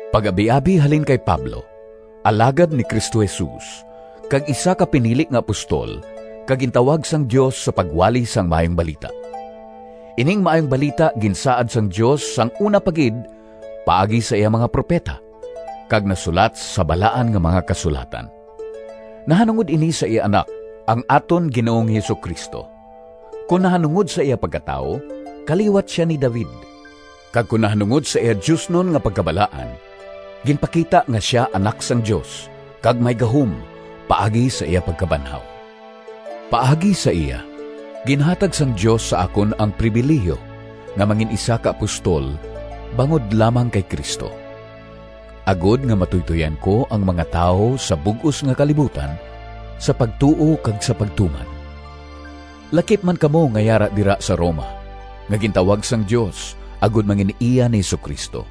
Pag-abiabi halin kay Pablo, alagad ni Cristo Jesus, kag isa ka pinili nga apostol kag gintawag sang Dios sa pagwali sang Maayong Balita. Ining Maayong Balita ginsaad sang Dios sang una pa gid paagi sa iya mga propeta, kag nasulat sa Balaan nga mga Kasulatan. Nahanungod ini sa iya Anak, ang aton Ginoong Jesu-Cristo: kon nahanungod sa iya pagkatawo, kaliwat sia ni David; kag kon nahanungod sa iya diosnon nga pagkabalaan, ginpakita nga sia Anak sang Dios kag may gahom, paagi sa iya pagkabanhaw. Paagi sa iya, ginhatag sang Dios sa akon ang pribilihiyo nga mangin-isa ka apostol bangod lamang kay Cristo, agod nga matuytoyan ko ang mga tawo sa bug-os nga kalibutan sa pagtuo kag sa pagtuman; lakip man kamo nga yara dira sa Roma, nga gintawag sang Dios agod mangin-iya ni Jesu-Cristo.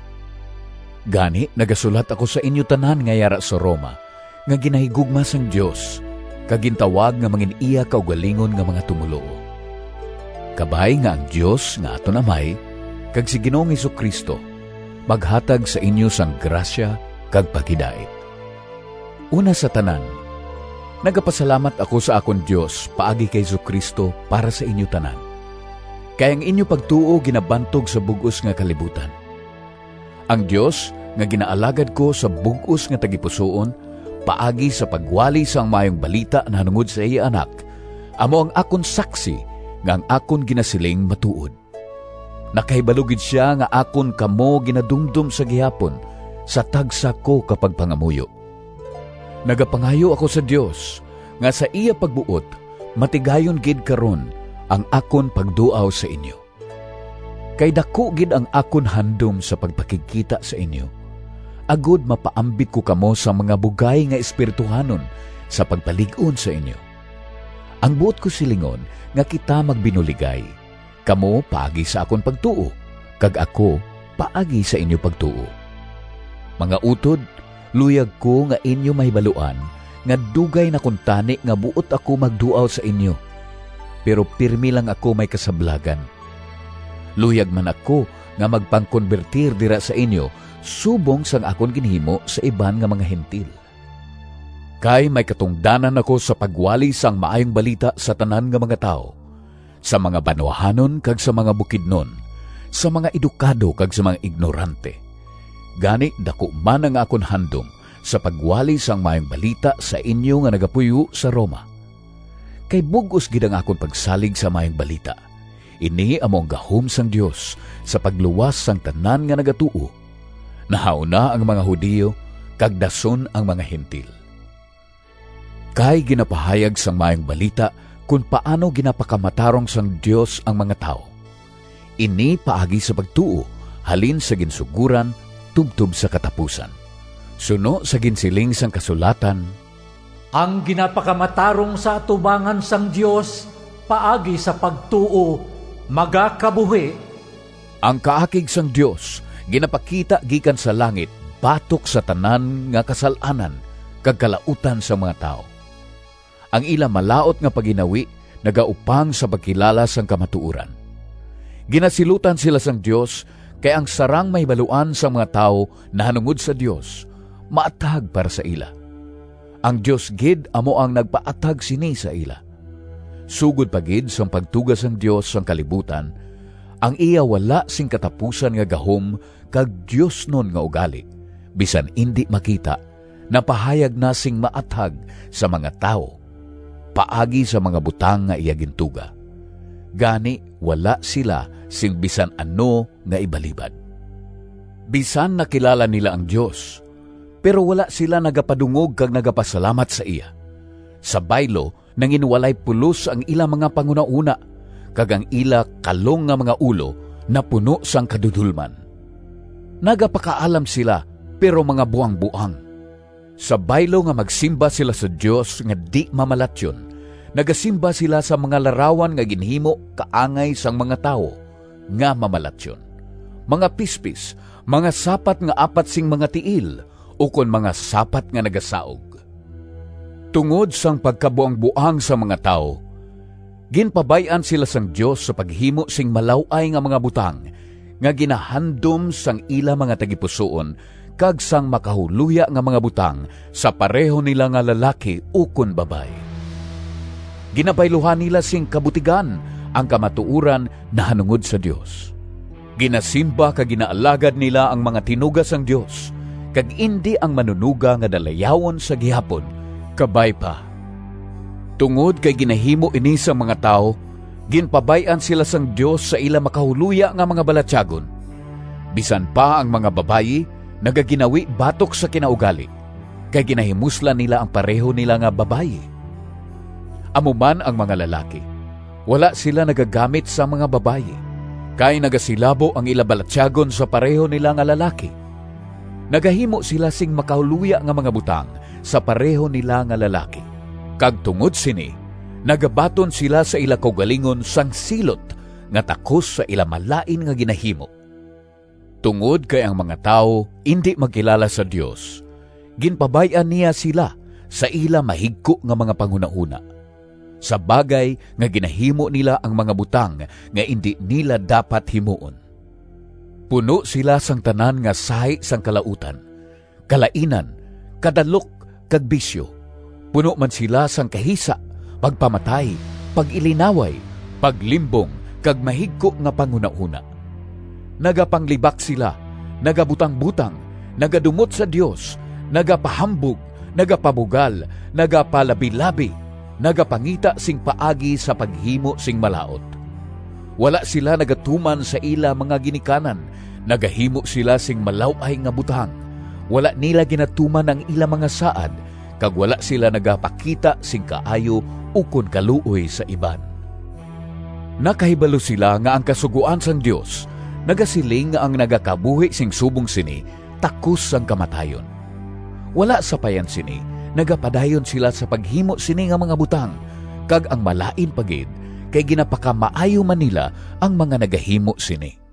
Gani, nagasulat ako sa inyo tanan nga yara sa Roma nga ginahigugma sang Dios kag gintawag nga mangin-iya kaugalingon nga mga tumoluo. Kabay nga ang Dios nga aton Amay kag si Ginoong Jesu-Cristo maghatag sa inyo sang grasya kag paghidait. Una sa tanan, nagapasalamat ako sa akon Dios paagi kay Jesu-Cristo para sa inyo tanan, kay ang inyo pagtuo ginabantog sa bug-os nga kalibutan. Ang Dios nga ginaalagad ko sa bug-os nga tagipusoon, paagi sa pagwali sang Maayong Balita nahanungod sa iya Anak, amo ang akon saksi nga ang akon ginasiling matuod. Nakahibalo gid sia nga akon kamo ginadumdom sa gihapon sa tagsa ko ka pagpangamuyo. Nagapangayo ako sa Dios nga sa iya pagbuot matigayon gid karon ang akon pagduaw sa inyo. Kay daku gid ang akon handom sa pagpakigkita sa inyo, agod mapaambit ko kamo sang mga bugay nga espirituhanon sa pagpalig-on sa inyo. Ang buot ko silingon nga kita magbinuligay, kamo paagi sa akon pagtuo kag ako paagi sa inyo pagtuo. Mga utod, luyag ko nga inyo mahibaluan, nga dugay na kuntani nga buot ako magduaw sa inyo, pero pirme lang ako may kasablagan. Luyag man ako magpangkonbertir dira sa inyo subong sang akon ginhimo sa iban nga mga Gentil. Kay may katungdanan ako sa pagwali sang Maayong Balita sa tanan nga mga tawo, sa mga banwahanon kag sa mga bukidnon, sa mga edukado kag sa mga ignorante. Gani, daku man ang akon handom sa pagwali sang Maayong Balita sa inyo nga nagapuyo sa Roma. Kay bug-os gid ang akon pagsalig sa Maayong Balita. Ini amo ang gahom sang Dios sa pagluwas sang tanan nga nagatuo, nahauna ang mga Judio kag dason ang mga Gentil. Kay ginapahayag sang Maayong Balita kon paano ginapakamatarong sang Dios ang mga tawo: ini paagi sa pagtuo halin sa ginsugoran tubtob sa katapusan. Suno sa ginsiling sang kasulatan, “Ang ginapakamatarong sa atubangan sang Dios paagi sa pagtuo magakabuhi.” Ang kaakig sang Dios ginapakita gikan sa langit batok sa tanan nga kasal-anan kag kalautan sang mga tawo. Ang ila malaut nga pagginawi nagaupang sa pagkilala sang kamatuoran. Ginasilutan sila sang Dios, kay ang sarang mahibaluan sang mga tawo nahanungod sa Dios maathag para sa ila. Ang Dios gid amo ang nagpaathag sini sa ila. Sugod pa gid sang pagtuga sang Dios sang kalibutan, ang iya wala sing katapusan nga gahom kag diosnon nga ugali, bisan indi makita, napahayag na sing maathag sa mga tawo paagi sa mga butang nga iya gintuga. Gani wala sila sing bisan ano nga ibalibad! Bisan nakilala nila ang Dios, pero wala sila nagapadungog kag nagapasalamat sa iya. Sa baylo, nanginwalay pulos ang ila mga panghunahona kag ang ila kalong nga mga ulo napuno sang kadudolman. Nagapakaalam sila, pero mga buangboang. Sa baylo nga magsimba sila sa Dios nga di-mamalatyon, nagasimba sila sa mga larawan nga ginhimo kaangay sang mga tawo nga mamalatyon, mga pispis, mga sapat nga apat sing mga tiil ukon mga sapat nga nagasaug. Tungod sang pagkabuangboang sang mga tawo, ginpabay-an sila sang Dios sa paghimo sing malaw-ay nga mga butang nga ginahandom sang ila mga tagipusoon kag sang makahuloya nga mga butang sa pareho nila nga lalaki ukon babayi. Ginabayluhan nila sing kabutigan ang kamatuoran nahanungod sa Dios. Ginasimba kag ginaalagad nila ang mga tinuga sang Dios, kag indi ang Manunoga nga dalayawon sa gihapon! Kabay pa. Tungod kay ginahimo ini sang mga tawo, ginpabay-an sila sang Dios sa ila makahuloya nga mga balatyagon. Bisan pa ang mga babayi nagaginawi batok sa kinaugali, kay ginahimuslan nila ang pareho nila nga babayi. Amo man ang mga lalaki, wala sila nagagamit sang mga babayi, kay nagasilabo ang ila balatyagon sa pareho nila nga lalaki. Nagahimo sila sing makahuloya nga mga butang sa pareho nila nga lalaki, kag tungod sini nagabaton sila sa ila kaugalingon sang silot nga takos sa ila malain nga ginahimo. Tungod kay ang mga tawo indi magkilala sa Dios, ginpabay-an niya sila sa ila mahigko nga mga panghunahona, sa bagay nga ginahimo nila ang mga butang nga indi nila dapat himuon. Puno sila sang tanan nga sahi sang kalautan, kalainan, kadalok kag bisyo; puno man sila sang kahisa, pagpamatay, pag-ilinaway, paglimbong kag mahigko nga panghunahona. Nagapanglibak sila, nagabutangbotang, nagadumot sa Dios, nagapahambog, nagapabugal, nagapalabilabi, nagapangita sing paagi sa paghimo sing malaut. Wala sila nagatuman sa ila mga ginikanan, nagahimo sila sing malaw-ay nga butang, wala nila ginatuman ang ila mga saad, kag wala sila nagapakita sing kaayo ukon kaluoy sa iban. Nakahibalo sila nga ang kasugoan sang Dios nagasiling nga ang nagakabuhi sing subong sini takos sang kamatayon. Wala sapayan sini, nagapadayon sila sa paghimo sini nga mga butang, kag ang malain pa gid, kay ginapakamaayo man nila ang mga nagahimo sini.